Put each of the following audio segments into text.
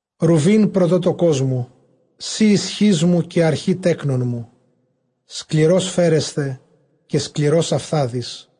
Ῥουβὴν πρωτότοκός μου, σὺ ἰσχύς μου, καὶ ἀρχὴ τέκνων μου, σκληρὸς φέρεσθαι, καὶ σκληρὸς αὐθάδης.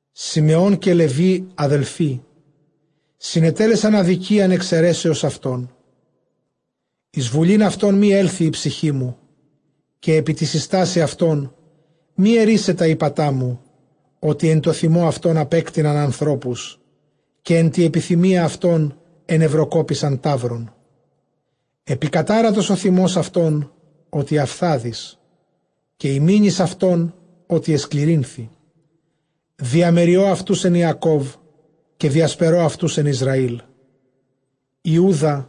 Συμεὼν καὶ Λευὶ ἀδελφοὶ συνετέλεσαν ἀδικίαν ἐξαιρέσεως αὐτῶν· Εἰς βουλὴν αὐτῶν μὴ ἔλθοι ἡ ψυχή μου, καὶ ἐπὶ τῇ συστάσει αὐτῶν μὴ ἐρίσαι τὰ ἥπατά μου· ὅτι ἐν τῷ θυμῷ αὐτῶν ἀπέκτειναν ἀνθρώπους, καὶ ἐν τῇ ἐπιθυμίᾳ αὐτῶν ἐνευροκόπησαν ταῦρον. Ἐπικατάρατος ὁ θυμὸς αὐτὼν, ὅτι αὐθάδης· καὶ ἡ μῆνις αὐτῶν, ὅτι ἐσκληρύνθη· διαμεριῷ αὐτοὺς ἐν Ἰακὼβ, καὶ διασπερῷ αὐτοὺς ἐν Ἰσραήλ. Ἰούδα,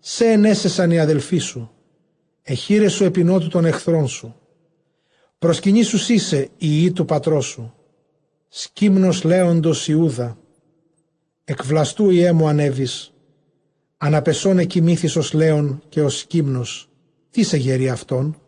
σὲ αἰνέσαισαν οἱ ἀδελφοί σου· αἱ χεῖρές σου ἐπὶ νώτου τῶν ἐχθρῶν σου· προσκυνήσουσί σοι οἱ υἱοὶ τοῦ πατρός σου. Σκύμνος λέοντος Ἰούδα· ἐκ βλαστοῦ, υἱέ μου, ἀνέβης· ἀναπεσὼν ἐκοιμήθης ὡς λέων καὶ ὡς σκύμνος· τίς ἐγερεῖ αὐτόν;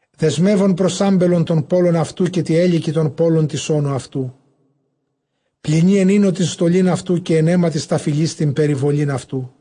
Δεσμεύων πρὸς ἄμπελον τὸν πῶλον αὐτοῦ, καὶ τῇ ἕλικι τὸν πῶλον τῆς ὄνου αὐτοῦ, πλυνεῖ ἐν οἴνῳ τὴν στολὴν αὐτοῦ, καὶ ἐν αἵματι σταφυλῆς τὴν περιβολὴν αὐτοῦ.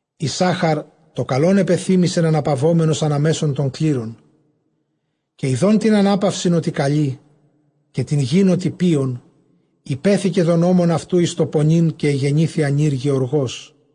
Ἰσσάχαρ τὸ καλὸν ἐπεθύμησεν, ἀναπαυόμενος ἀνὰ μέσον τῶν κλήρων. Καὶ ἰδὼν τὴν ἀνάπαυσιν ὅτι καλὴ, καὶ τὴν γῆν ὅτι πίων, ὑπέθηκε τὸν ὦμον αὐτοῦ εἰς τὸ πονεῖν, καὶ ἐγενήθη ἀνὴρ γεωργός.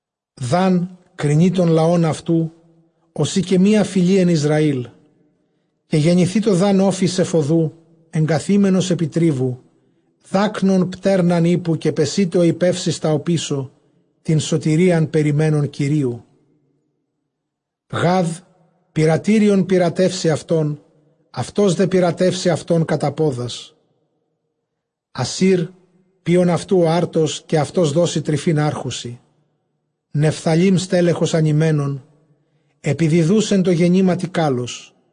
Δὰν κρινεῖ τὸν λαὸν αὐτοῦ, ὡσεὶ καὶ μία φυλὴ ἐν Ἰσραήλ. Καὶ γενηθητω Δὰν ὄφις ἐφʼ ὁδοῦ, ἐγκαθήμενος ἐπὶ τρίβου, δάκνων πτέρναν ἵππου· καὶ πεσεῖται ὁ ἱππεὺς εἰς τὰ ὀπίσω, τὴν σωτηρίαν περιμένων Κυρίου. Γὰδ, πειρατήριον πειρατεύσει αὐτόν· αὐτὸς δὲ πειράτεύσει αὐτὸν κατὰ πόδας. Ἀσὴρ, πίων αὐτοῦ ὁ ἄρτος· καὶ αὐτὸς δώσει τρυφὴν ἄρχουσι. Νεφθαλὶ στέλεχος ἀνειμένον, ἐπιδιδοὺς ἐν τῷ γεννήματι κάλλος.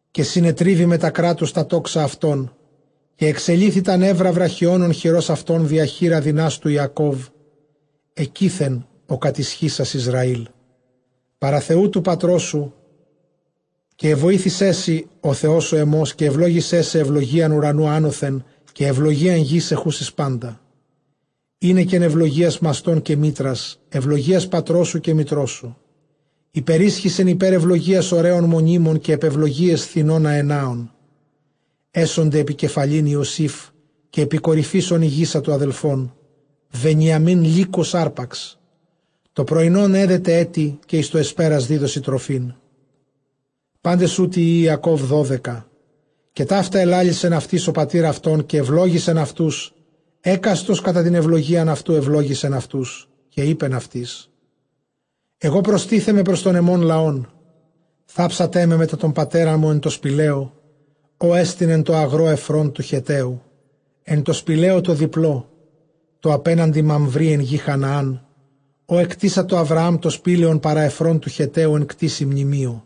Καὶ συνετρίβη μετὰ κράτους τὰ τόξα αὐτῶν· καὶ ἐξελύθη τὰ νεῦρα βραχιόνων χειρὸς αὐτῶν, διὰ χεῖρα δυνάστου Ἰακώβ· ἐκεῖθεν ὁ κατισχύσας Ἰσραὴλ παρὰ Θεοῦ τοῦ πατρός σου. Καὶ ἐβοήθησέ σοι ὁ Θεὸς ὁ ἐμὸς, καὶ εὐλόγησέ σε εὐλογίαν οὐρανοῦ ἄνωθεν, καὶ εὐλογίαν γῆς ἐχούσης πάντα, εἵνεκεν εὐλογίας μαστῶν καὶ μήτρας, εὐλογίας πατρός σου καὶ μητρός σου· ὑπερίσχυσεν ὑπὲρ εὐλογίας ὀρέων μονίμων, καὶ ἐπʼ εὐλογίαις θινῶν ἀενάων· ἔσονται ἐπὶ κεφαλὴν Ἰωσὴφ, καὶ ἐπὶ κορυφῆς ὧν ἡγήσατο ἀδελφῶν. Βενιαμὶν λύκος ἅρπαξ, τὸ πρωϊνὸν ἔδεται ἔτι, καὶ εἰς τὸ ἑσπέρας δίδωσι τροφήν. Πάντες οὕτοι υἱοὶ Ἰακὼβ δώδεκα· καὶ ταῦτα ἐλάλησεν αὐτοῖς ὁ πατὴρ αὐτῶν· καὶ εὐλόγησεν αὐτούς· ἕκαστον κατὰ τὴν εὐλογίαν αὐτοῦ εὐλόγησεν αὐτούς. Καὶ εἶπεν αὐτοῖς, ἐγὼ προστίθεμαι πρὸς τὸν ἐμὸν λαόν· θάψτέ με μετὰ τῶν πατέρων μου ἐν τῷ σπηλαίῳ, ὅ ἐστιν ἐν τῷ ἀγρῷ Ἐφρὼν τοῦ Χετταίου, ἐν τῷ σπηλαίῳ τῷ διπλῷ, τῷ ἀπέναντι Μαμβρῆ, ἐν γῇ Χαναὰν, ὃ ἐκτήσατο Ἁβραὰμ τὸ σπήλαιον παρὰ Ἐφρὼν τοῦ Χετταίου ἐν κτήσει μνημείου.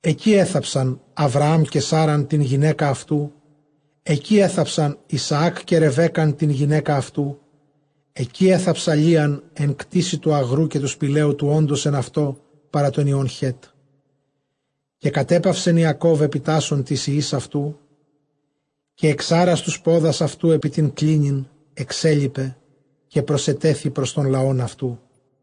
Ἐκεῖ ἔθαψαν Ἁβραὰμ καὶ Σάῤῥαν τὴν γυναῖκα αὐτοῦ· ἐκεῖ ἔθαψαν Ἰσαὰκ καὶ Ῥεβέκκαν τὴν γυναῖκα αὐτοῦ· ἐκεῖ ἔθαψαν Λείαν· Ἐν κτήσει τοῦ ἀγροῦ καὶ τοῦ σπηλαίου τοῦ ὄντος ἐν αὐτῷ, παρὰ τῶν υἱῶν Χέτ. Καὶ κατέπαυσεν Ἰακὼβ ἐπιτάσσων τοῖς υἱοῖς αὐτοῦ· καὶ ἐξᾴρας τοὺς πόδας αὐτοῦ ἐπὶ τὴν κλίνην, ἐξέλιπε· καὶ προσετέθη πρὸς τὸν λαὸν αὐτοῦ.